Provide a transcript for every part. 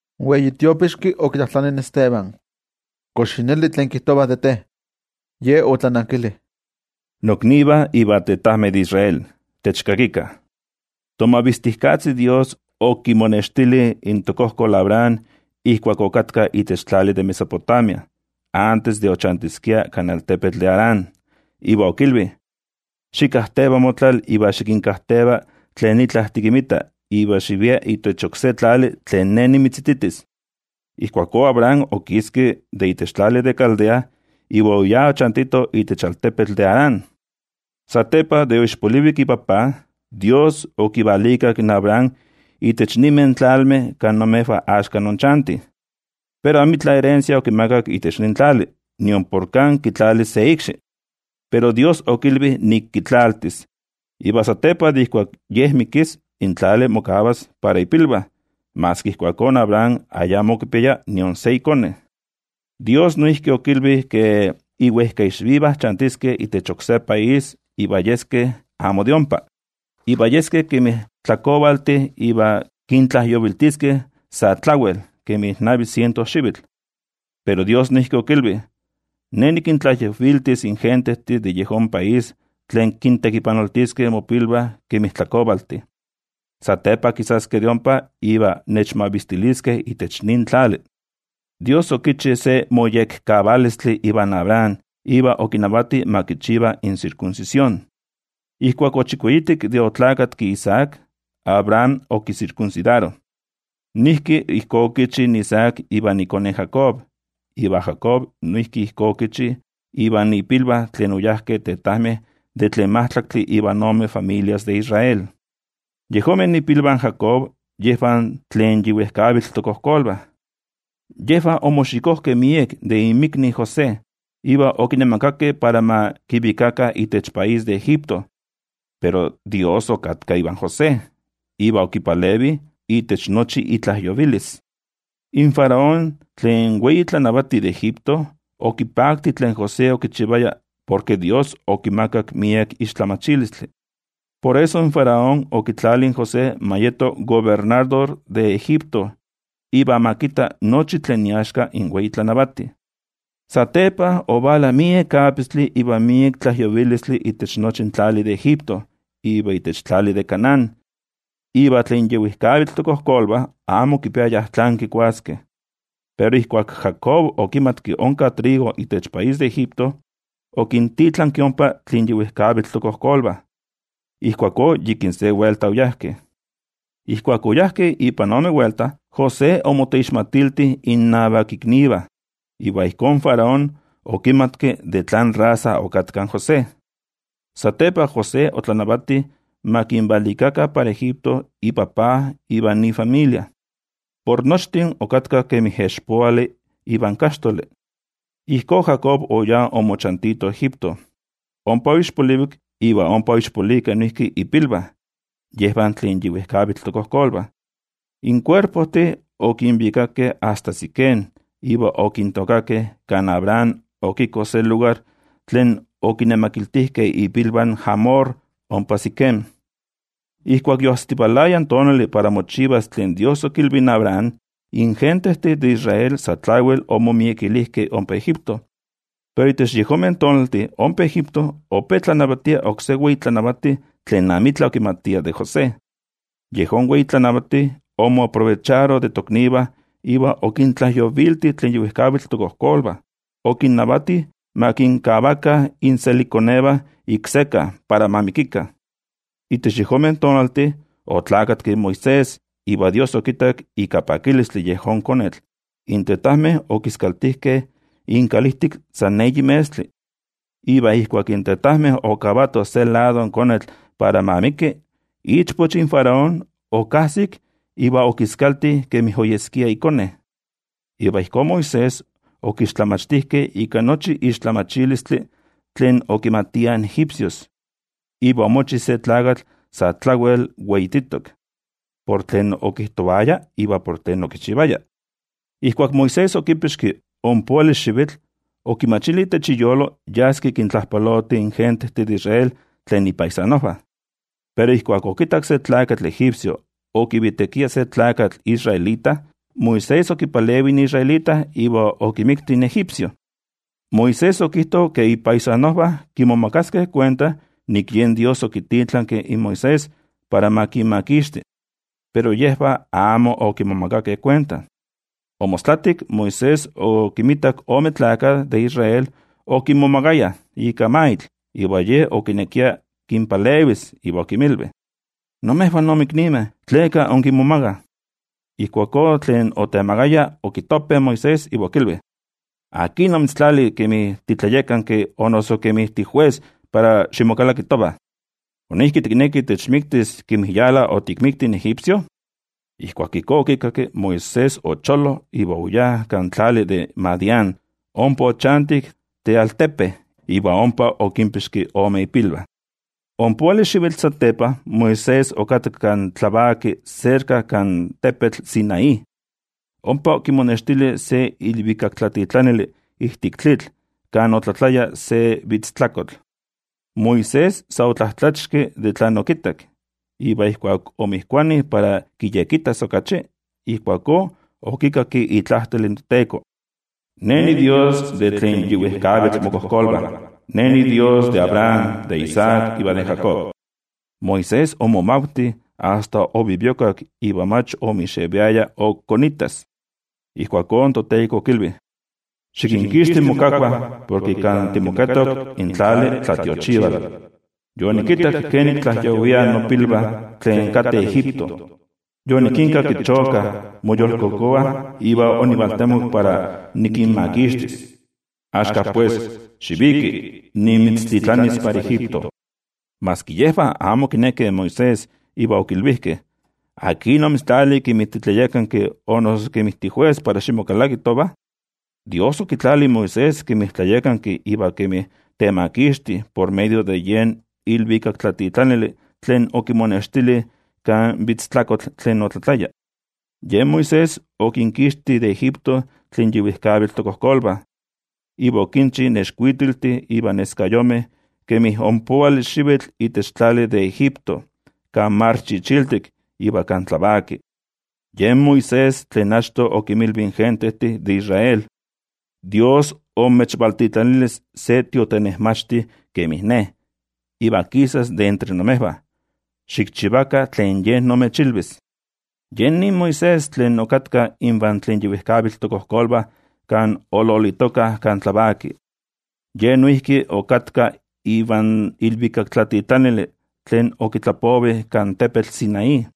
In wei tiopixki okitlajtlani in Esteban: —¿Kox yi neli tlen kijtovah de te? Ye otlanankili: —Noknivah iva tetajmeh de Israel, techkakikah: Tomavistijkatzi Dios okimonextili in tokojkol Abraham ijkuak okatka itech tlali de Mesopotamia, antes de ochantiskia kan altepetl de Harán, iva okilvi: “Xikajteva motlal iva xikinkajteva tlen itla tikinmita, iva xivia itech oksé tlali tlen Ne nimitzititis.” Ijkuakó Abraham okiski itech tlali de Caldea iva oyá ochantito itech altepetl de Harán. Satepa de oixpolivik ipapa, in toYejwatzi okivalikak in Abraham itech ninmeh tlalmeh kan imejvah axka inchantih. Pero amitla erensia okimakak itech nin tlali, nion por kan kitlalis se ikxi. Pero toYejwatzi okilvi nik kitlaltis, iva satepa de ijkuak ye mikis in tlali mokavas para ipilvah, maski ijkuakó Abraham ayamo okipiaya nion se ikone. In toYejwatzi noijki okilvi ke iwejkaixvivah chantiskeh itech oksé país iva yeskeh amo de ompa, iva yeskeh kemi tlakovaltih iva kintlajyoviltiskeh sa tlawel kemi navi siento xivitl. Pero toYejwatzi noijki okilvi: “Ne nikintlajyoviltis in gentejtih de yejón país tlen kintekipanoltiskeh mopilvah kemi tlakovaltih. Satepa kisaskeh de ompa iva nechmavistiliskeh itech nin tlali.” In toYejwatzi okichi se moyekkavalistli ivan Abraham iva okinavati ma kichiva in sirkunsisión. Ijkuak ochikueyitik de oneski Isaac, Abraham okisirkunsidaro. Noijki ijkó okichi in Isaac ivan ikone Jacob, iva Jacob noijki ijkó okichi ivan ipilvah tlen oyajkeh tetajmeh de tlen majtlaktli ivan ome familias de Israel. ’Yejonmeh ipilvah in Jacob yejvah tlen yi wejkavitl tokojkolvah, yejvah omoxikojkeh miek de inmikni José iva okinemakakeh para ma kivikakah itech país de Egipto. Pero toYejwatzi okatka ivan José, iva okipalevi itech nochi itlajyovilis. In Faraón, tlen wei tlanavati de Egipto, okipakti tlen José okichivaya porke toYejwatzi okimakak miek tlamatilistli. Por eso in Faraón okitlali in José ma yeto kobernador de Egipto iva ma kitta nochi tlen iaxka in wei tlanavati. ’Satepa ovala miek apistli iva miek tlajyovilistli itech nochi in tlali de Egipto iva itech tlali de Canaán, iva tlen yi wejkavitl tokojkolvah amo okipiayah tlán kikuaskeh. Pero ijkuak Jacob okimatki onka trigo itech país de Egipto, okintitlanki ompa tlen yi wejkavitl tokojkolvah. Ijkuakó yikin se welta oyajkeh. Ijkuak oyajkeh ipan ome welta, José okinmoixmatilti in iknivah, iva ijkó in Faraón okinmixmatki ifamiliajvah in José. Satepa, José otlanavati ma kinvalikakah para Egipto ipapa ivan ifamilia. Por nochtin okatkah kemi expoali ivan kaxtoli. Ijkó, Jacob oyá omochantito Egipto, ompa oixpolivik iva ompa oixpolikeh noijki ipilvah, yejvah tlen yi wejkavitl tokojkolvah. In kuerpojtih okinvikakeh asta Siquem iva okintookakeh kan Abraham okiko se lugar tlen okinemakiltijkeh ipilvah in Hamor ompa Siquem. ’Ijkuak yoajsitivalaya in tonali para mochivas tlen toYejwatzi okilvi in Abraham, in gentejtih de Israel sa tlawel omomiekilijkeh ompa Egipto. Pero itech yejonmeh tonaltih ompa Egipto ope tlanavatia oksé wei tlanavati tlen amitla okimatia de José. Yejón wei tlanavati okinmonexikitili in toknivah iva okintlajyovilti tlen yi wejkavitl tokojkolvah, okinnavati ma kinkavakah inselikkonevah ik sekka para ma mikikah. Itech yejonmeh tonaltih oneski Moisés iva toYejwatzi okittak ika pakilistli yejón konetl. In tetajmeh okiskaltijkeh inkalijtik san eyi metztli. Iva ijkuak in tetajmeh okavatoh in konetl se lado para ma miki, ichpoch in Faraón okajsik iva okiskalti kemi oyeskia ikone. Iva ijkó Moisés okixtlamachtijkeh ika nochi tlamatilistli tlen okimatiah in egipcios, iva omochi se tlakatl sa tlawel weititok por tlen okijtovaya iva por tlen okichivaya. ’Ijkuak Moisés okipixki ompoali xivitl, okimachili itech iyolo yaski kintlajpaloti in gentejtih de Israel tlen ipaisanojvah. Pero ijkuak okittak se tlakatl egipcio okivitekia se tlakatl israelita, Moisés okipalevi in israelita iva okimikti in egipcio. Moisés okijto ke ipaisanojvah kimomakaskeh kuenta nik yen toYejwatzi okititlanki in Moisés para ma kinmakixti, pero yejvah amo okimomakakeh kuenta. Omostlatik, Moisés okinmitak ome tlakah de Israel okimomagayah ika maitl, iva ye okinekia kinpalevis iva okinmilvi: “Imejvah inmiknimeh, ¿tleka inkimomagah?” Ijkuakó tlen otemagaya okitope in Moisés, iva okilvi: “¿Akin omitztlali kemi titlayakanki o noso kemi tijues para ximokalaki tovah? ¿Noijki tikneki techmiktis kemi yala otikmikti in egipcio?” Ijkuak ijkó okikakki, Moisés ocholo iva oyá kan tlali de Madián. Ompa ochantik tealtepe iva ompa okinpixki ome ipilvah. ’Ompoali xivitl satepa, Moisés okatka kan tlavaki serka kan tepetl Sinaí, ompa okimonextili se ilvikaktlatitlanili ijtik tlitl kan otlatlaya se kovatlanvitztli. Moisés sa otlatlachixki por tlen okittak, iva ijkuak omotoki para kiyekittas okachi, ijkuakó okikakki itlajtol in toTeko: “Ne niDios de tlen yi wejkavitl mokojkolvah. Ne niDios de Abraham, de Isaac iva de Jacob.” Moisés omomavti asta oviviokak iva mach ok omixeviaya ok konittas. Ijkuakó in toTeko okilvi: “Xikinkixti mokakvah porke kan timoketok in tlali tlatiochivali. Yonikittak kenik tlajyoviah nopilvah tlen kateh Egipto. Yonikinkakki chokah moyolkokova iva onivaltemok para nikinmakixtis. Axka pues, xiviki, nimitztitlanis para Egipto.” ’Yejvah amo okinekeh in Moisés iva okilvijkeh: “¿Akin omitztlali kemi titlayakanki o noso kemi tijues para ximokalaki tovah?” In toYejwatzi okititlanki in Moisés kemi tlayakanki iva kemi temakixti por medio de yen ilvikaktlatitlanili tlen okimonextili kan kovatlanvitztli tlen otlatlaya. Yen Moisés okinkixti de Egipto tlen yi wejkavitl tokojkolvah, iva okinchi nexkuitiltih iva neskayomeh kemi ompoali xivitl itech tlali de Egipto, kan Mar Chichiltik iva kan tlavaki. Yen Moisés tlen achto okinmilvi in gentejtih de Israel: “ToYejwatzi imechvaltitlanilis se tiotenejmachti kemin ne, iva kisas de entre imejvah. Xikchivakah tlen Ye imechilvis.” Yen nin Moisés tlen okatka invan tlen yi wejkavitl tokojkolvah kan ololitokah kan tlavaki. Ye noijki okatka ivan ilvikaktlatitlanili tlen okitlapovi kan tepetl Sinaí.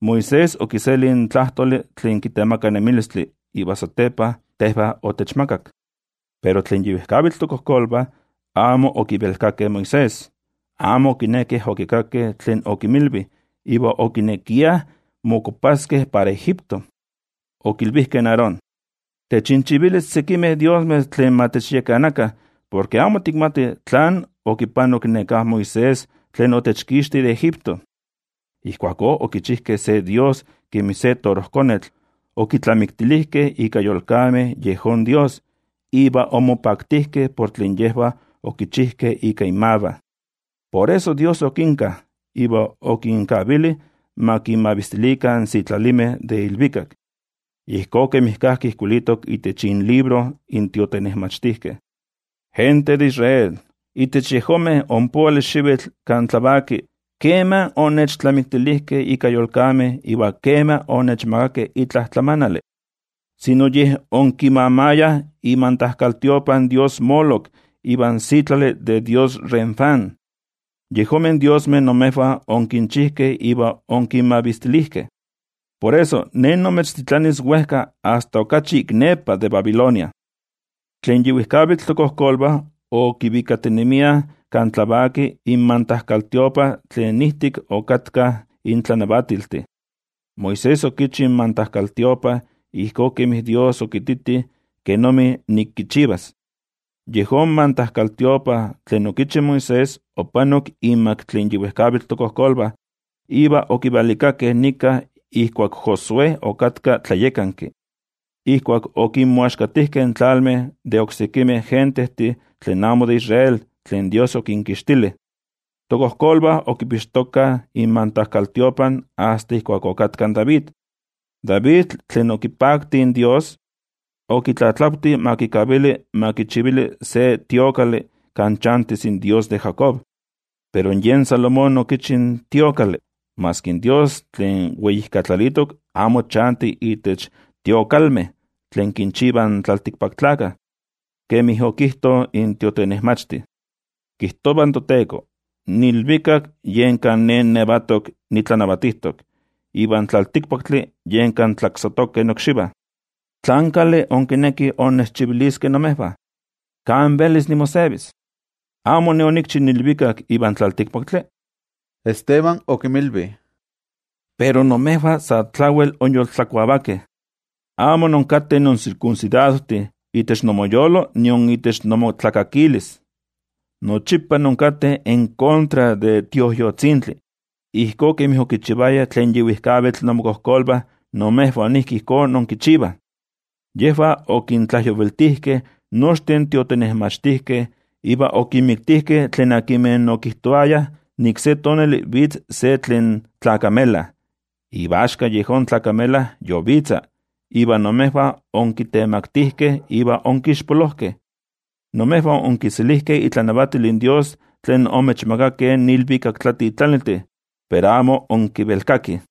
Moisés okiseli in tlajtoli tlen kitemaka nemilistli iva satepa tejvah otechmakak. ’Pero tlen yi wejkavitl tokojkolvah amo okivelkakeh in Moisés, amo okinekeh okikakkeh tlen okinmilvi iva okinekiah mokuapaskeh para Egipto. Okilvijkeh in Aarón: “Techinchivili sekimeh diosmeh tlen ma techyakanakah, porke amo tikmatih tlán okipanok neká Moisés tlen otechkixti de Egipto.” Ijkuakó okichijkeh se dios kemi se torojkonetl, okitlamiktilijkeh ika yolkameh yejón dios. Iva omopaktijkeh por tlen yejvah okichijkeh ika inmavah. Por eso toYejwatzi okinka, iva okinkavili ma kinmavistilikah in sitlalimeh de ilvikak. Ijkó kemi kajki ijkuilitok itech inlibro in tiotenejmachtijkeh: Gente de Israel, itech yejonmeh ompoali xivitl kan tlavaki, ¿kema onnechtlamiktilijkeh ika yolkameh iva kema onechmakakeh itla tlamanali? Amo, yej onkimamayah imantajkaltiopa in dios Moloc ivan sitlali de dios Renfán. Yejonmeh diosmeh imejvah onkinchijkeh iva onkinmavistilijkeh. Por eso, Ne nimechtitlanis wejka asta okachi ik nepa de Babilonia. ’Tlen yi wejkavitl tokojkolvah okivikatinemiah kan tlavaki in mantajkaltiopa tlen ijtik okatkah in tlanavatiltih. Moisés okichi in mantajkaltiopa ijkó kemi toYejwatzi okititi kenomi nik kichivas. Yejón mantajkaltiopa tlen okichi Moisés opanok inmak tlen yi wejkavitl tokojkolvah, iva okivalikakeh nika ijkuak Josué okatka tlayakanki, ijkuak okinmoaxkatijkeh in tlalmeh de oksekimeh gentejtih tlen amo de Israel tlen toYejwatzi okinkixtili. Tokojkolvah okipixtokah in mantajkaltiopa asta ijkuak ok okatka in David. David okipakti in toYejwatzi, iva okitlatlavti ma kikavili ma kichivili se templo kan chantis in Dios de Jacob. Pero yen Salomón okichi in templo. Maski in toYejwatzi tlen Weijkatlalitok amo chanti itech templojtih tlen kinchivah in tlaltikpaktlakah. Kemi okijto in tiotenejmachti: Kijtova in toTeko, in ilvikak yen kan Ne niyetok nitlanavatijtok, iva in tlaltikpaktli yen kan tlaksatokeh nokxivah. ¿Tlán kali inkinekih innechchiviliskeh imejvah? ¿Kan velis nimosevis? ¿Amo Ne onikchi in ilvikak ivan tlaltikpaktli? Esteban okinmilvi: —Pero imejvah sa tlawel inyoltlakuavakeh. Amo inkateh insirkunsidadojtih itech inmoyolo nion itech inmotlakakilis. Nochipa inkateh en kontra de in Tioijyotzintli, ijkó kemi okichivayah tlen yi wejkavitl inmokojkolvah imejvah noijki ijkó inkichivah. Yejvah okintlajyoviltijkeh nochtin tiotenejmachtijkeh, iva okinmiktijkeh tlen okijtovayah nik se tonali vitz se tlen tlakamela, iva axka yejón tlakamela yovitza, iva imejvah onkitemaktijkeh iva onkixpolojkeh. Imejvah onkiselijkeh itlanavatil in toYejwatzi tlen omechmakakeh in ilvikaktlatitlaniltih, pero amo inkivelkakih.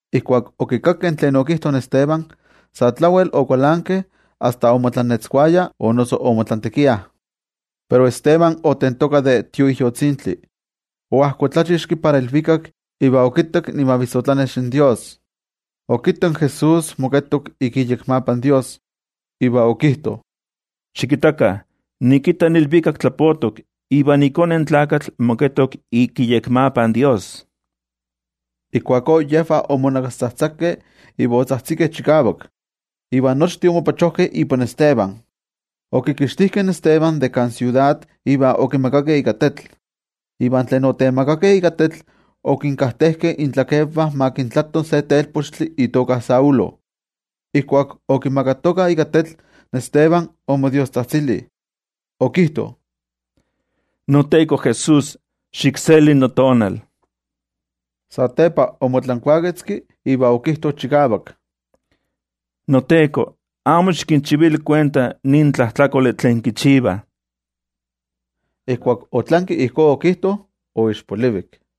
Ijkuak okikakkeh tlen okijto in Esteban, sa tlawel okualankeh asta omotlantekiah. Pero Esteban otentoka de Tioijyotzintli, oajkotlachixki para ilvikak iva okittak imavissotlanex in Dios. Okittak in Jesús moketok ik iyekmapa in Dios. Iva okijto: —Xikittakah, nikitta in ilvikak tlapotok, iva iKone in Tlakatl moketok ik iyekmapa in toYejwatzi. Ijkuakó yejvah omonakaspachojkeh iva otzajtzikeh chikavak, iva nochtin ipan oyajkeh in Esteban. Okixtijkeh de kan siudad iva okimagakeh ika tetl. Iva tlen otemagakeh ika tetl okinkajtejkeh intlakenvah ma kintlato se telpochtli itoka Saulo. Ijkuak okimagatokah ika tetl, Esteban omodiostzajtzili, okijto: —NoTeko Jesús, xikseli notonal. Satepa omotlankuaketzki iva okijto chikavak: —NoTeko, amo xikinchivili kuenta nin tlajtlakoli tlen kichivah. Ijkuak otlanki ijkó okijto, oixpolivik.